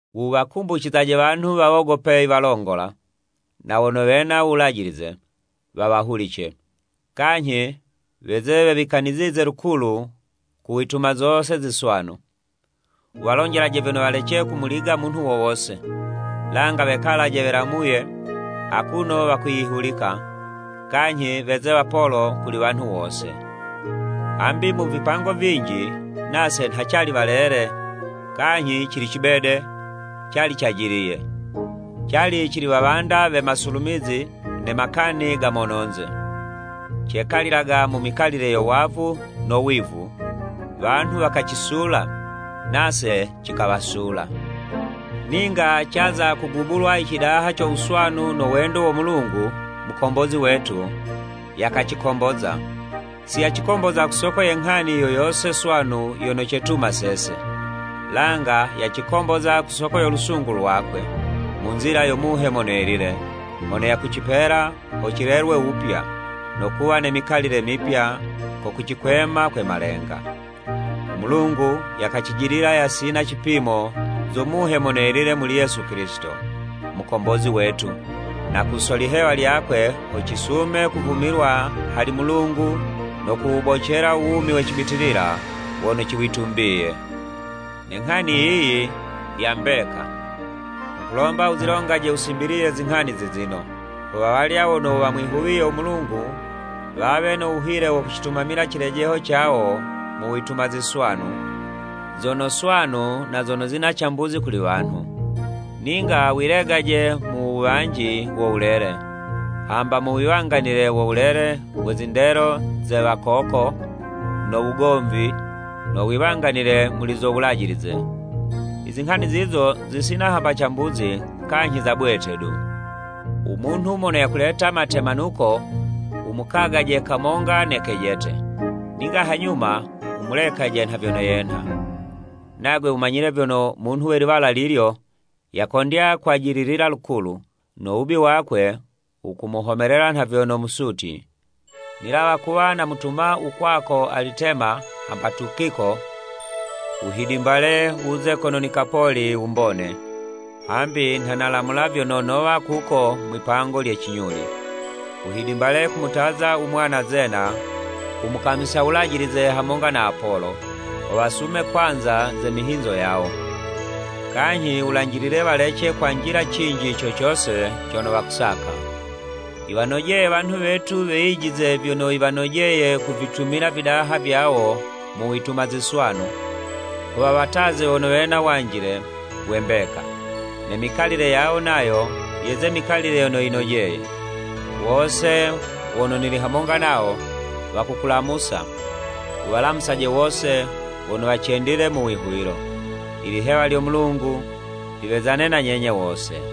Wuwakumbucizaje wanhu wawogope i walongola, na wono wena u wulajilize, wawahulice, kanyhi weze wewikanizize lukulu ku wituma zose ziswanu. Wuwalonjelaje vyono walece kumuliga munhu wo wose, langa wekalaje welamuye akuno wakwiyihulika, kanyhi weze wapolo kuli wanhu wose. Hambi mu vipango vinji, nase nha cali walele, kanyhi cili cibede, cali cajiliye. Cali cili wawanda we masulumizi ne makani ga mononze. Cekalilaga mu mikalile yo wavu no wivu, wanhu wakacisula, nase cikawasula. Ninga caza kugubulwa i cidaha co wuswanu no wendo wo Mulungu, Mukombozi wetu, yakacikomboza. Si yacikomboza ku soko ye nghani yo yose swanu yono cetuma sese, langa yacikomboza ku soko yo lusungu lwakwe, mu nzila yo Muhe Mono Yelile mono yakucipela ho cilelwe wupya, no kuwa ne mikalile mipya ko kucikwema kwe malenga. U Mulungu yakacijidila yasina cipimo zo Muhe Mono Yelile muli Yesu Kilisito, Mukombozi wetu, na ku so lihewa lyakwe ho cisume kuvumilwa hali Mulungu no kuwubocela u Wumi we cibitilila wono ciwitumbiye. Ne nghani yiyi ya mbeka. Nghukulomba wuzilongaje wusimbiliye zinghani zi zino, ho wawalya wono wamwihuwiye u Mulungu wawe no wuhile wo kucitumamila cilejeho cawo mu wituma ziswanu, zono swanu na zono zina cambuzi kuli wanhu. Ninga wilegaje mu wuwanji wo wulele, hamba mu wiwanganile wo wuwale we zindelo ze wakoko, no wugomvi, no wiwanganile muli zo Wulajilize. I zinghani zizo zisina hamba cambuzi kanyhi za bwete du. U munhu mono yakuleta matemanuko, wumukagaje kamonga ne kejete, ninga hanyuma wumulekaje nha vyono yenha. Nagwe wumanyile vyono munhu we liwala lilyo yakondya kwajililila lukulu, no wubi wakwe wukumuhomelela nha vyono musutyi. Nilawa kuwa namutuma u kwako Alitema hamba Tukiko, wuhidimbale wuze kono Nikapoli wumbone, hambi nha nalamula vyono nowa kuko mwipango lye cinyuli. Wuhidimbale kumutaza u mwana Zena u mukamisa uwulajilize hamonga na Apolo, ho wasume kwanza ze mihinzo yawo, kanyhi wulanjilile walece kwanjila cinji co cose cono wakusaka. Yiwanojeye wanhu wetu weyijize vyono yiwanojeye kuvitumila vidaha vyawo mu wituma ziswanu, ho wawataze wono wena wanjile we mbeka, ne mikalile yawo nayo yeze mikalile yono yinojeye. Wose wono nili hamonga nawo, wakukulamusa. Wuwalamusaje wose wono wacendile mu wihuwilo. Ilihewa lyo Mulungu liwezane na nyenye wose.